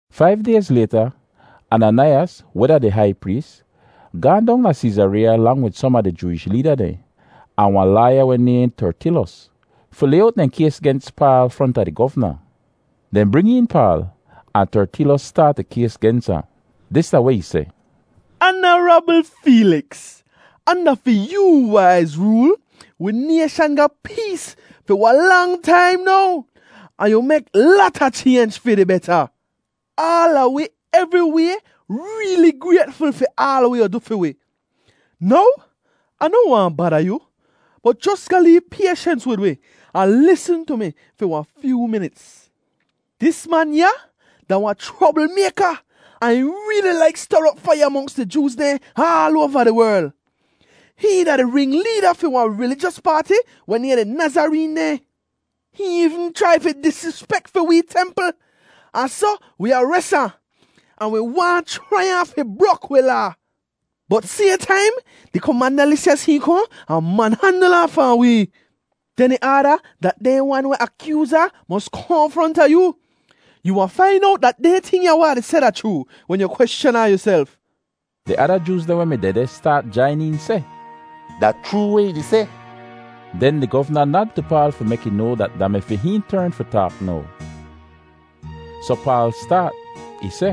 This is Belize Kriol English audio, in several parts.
Faiv dayz layta, Ananaiyas, weh da di hai prees, gaahn dong da Seezareeya lang wid som a di Jooish leeda dehn, ahn wahn laaya weh nayhn Tertilos, fi lay owt dehn kays gens Paal fronta di govna. Dehn bring een Paal, ahn Tertilos staat ih kays gens ahn. Dis da weh ih seh: “Anarabl Feeliks, anda fi yoo waiz rool, wi nayshan ga pees fi wahn lang taim now, ahn yu mek lata chaynj fi di beta. Aala wi evriway reeli graytful fi aal weh yu du fi wi. Now Ah noh waahn bada yu, bot jos ga lee payshens wid wi ahn lisn tu mi fi wahn fyoo minits. “Dis man ya da wahn chroblmayka ahn ih reeli laik ster op faiya monks di Jooz dehn aal oava di werl. Hihn da di ringleeda fi wahn rilijos paati weh nayhn di Nazareen dehn. Hihn eevn chrai fi disrispek fi wee templ, ahn soh wi ares ahn, [ahn wi waahn chrai ahn fi brok wi Laa. Bot sayhn taim, di komanda Lisyas hihn kohn ahn manhandl ahn fahn wee. Den ih aada dat dehn wan weh akyooz ahn mos kohn fronta yoo.] Yu wahn fain owt dat dehn ting ya weh Ah di seh da chroo wen yu kweschan ahn yuself.” Di ada Jooz dehn weh mi dehdeh staat jain een seh, “Da chroo weh ih di seh.” Den di govna nad tu Paal fi mek ih noa dat da mi fi hihn tern fi taak now. Soh Paal staat. Ih seh,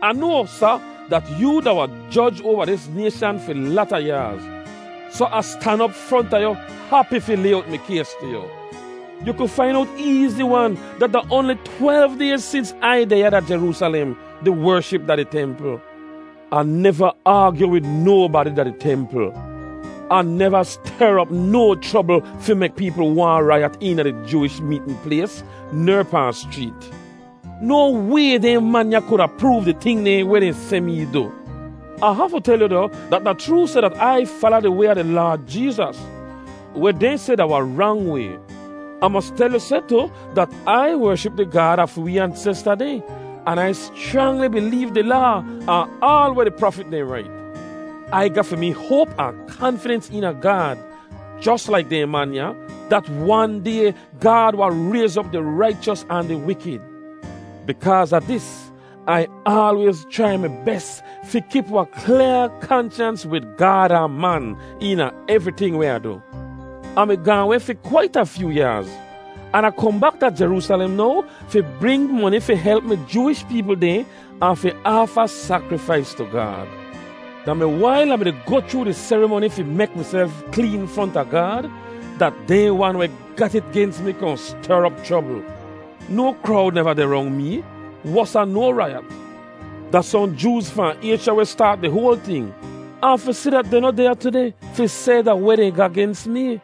“Ah noa, Sa, dat yoo da wahn joj oava dis nayshan fi lata yaaz, soh Ah stan op fronta yu hapi fi lay owt mi kays tu yu. Yu ku fain owt eezi-wan dat da oanli twelv dayz sins Ai deh ya da Jeroosalem, di wership da di templ. Ah neva aagyu wid nobadi da di templ. Ah neva ster op no chrobl fi mek peepl waahn raiyat eena di Jooish meetn plays ner pahn schreet. No way dehn man ya kuda proov di ting dehn weh dehn seh mee du. “Ah hafu tel yu doh, dat da chroo seh dat Ai fala Di Way a di Laad Jeezas, weh dehn seh da wahn rang way. Ah mos tel yu seh tu dat Ai wership di Gaad a fi wee ansesta dehn, an Ai schrangli bileev di Laa ahn aal weh di prafit dehn rait. Ai ga fi mee hoap ahn kanfidens eena Gaad jos laik dehn man ya, dat wan day Gaad wahn rayz op di raichos ahn di wikid. Bikaaz a dis, Ai aalwayz chrai mi bes fi kip wahn klyaa kanshans wid Gaad ahn man eena evriting weh Ah du. “Ah mi gaahn weh fi kwait a fyoo yaaz, an Ah kohn bak da Jeroosalem now fi bring moni fi help mi Jooish peepl dehn ahn fi aafa sakrifais tu Gaad. Da mi wail Ah mi-di goh chroo di serimoni fi mek miself kleen fronta Gaad dat dehn wan weh gat it gens mi kohn ster op chrobl. No krowd neva deh rong mee, wosa no raiyat. “Da sohn Jooz fahn Aysha weh staat di hoal ting, ahn fi si dat dehn noh deh ya tudeh fi seh da weh dehn ga gens mee.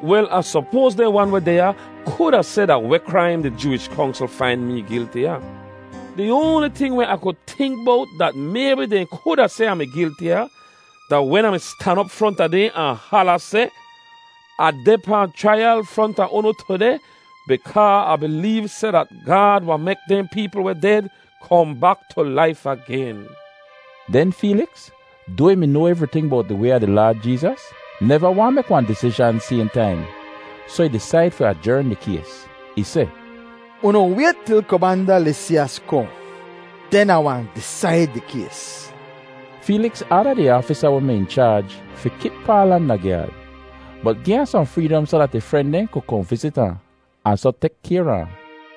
Wel, Ah sopoaz dehn wan weh deh ya kuda seh da weh kraim di Jooish Kongsl fain mee gilti a. Di oanli ting weh Ah ku tink bowt dat maybi dehn kuda seh Ah mi gilti a, da wen Ah mi stan op fronta dehn ahn hala seh, ‘Ah deh pahn chraiyal fronta unu tudeh bikaa Ah bileev seh dat Gaad wahn mek dehn peepl weh ded kohn bak tu laif agen!’” Den Feeliks, doa ih mi noa evriting bowt di Way a di Laad Jeezas, neva waahn mek wahn disizhan sayhn taim, soh ih disaid fi ajern di kays. Ih seh, “Unu wayt til Komanda Lisyas kohn, den Ah wahn disaid di kays.” Feeliks aada di aafisa weh mi in chaaj fi kip Paal anda gyaad, bot gi ahn sohn freedom soh dat ih fren dehn ku kohn vizit ahn, ahn soh tek kayr a ahn.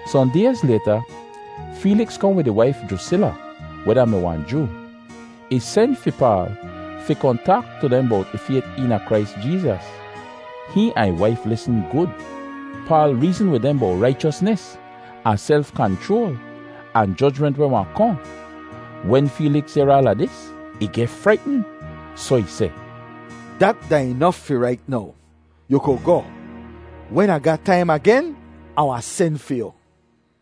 Sohn dayz layta, Feeliks kohn wid ih waif Jrusila, weh da-mi wahn Joo. Ih sen fi Paal fi kohn taak tu dehn bowt ih fayt eena Krais Jeezas. Hihn ahn ih waif lisn gud. Paal reezn wid dehn bowt raichosnis, ahn self-kanchroal, ahn jojment weh wahn kohn. Wen Feeliks yehr aala dis, ih geh fraitn. Soh ih seh, “Dat da inof fi rait now. Yu ku goh. Wen Ah ga taim agen, Ah wahn sen fi yu.”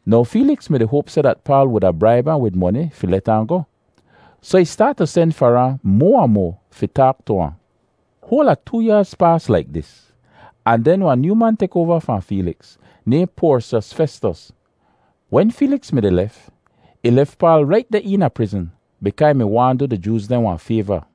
Now Feeliks mi-di hoap seh dat Paal wuda braib ahn wid moni fi let ahn goh, soh ih staat tu sen far ahn moa ahn moa fi taak tu ahn. Hoal a too yaaz paas laik dis, ahn den wahn nyoo man tek oava fahn Feeliks, nayhn Porsyos Festos. Wen Feeliks mi-di lef, ih lef Paal rait deh eena prizn bikaa ih mi waahn du di Jooz dehn wahn fayva.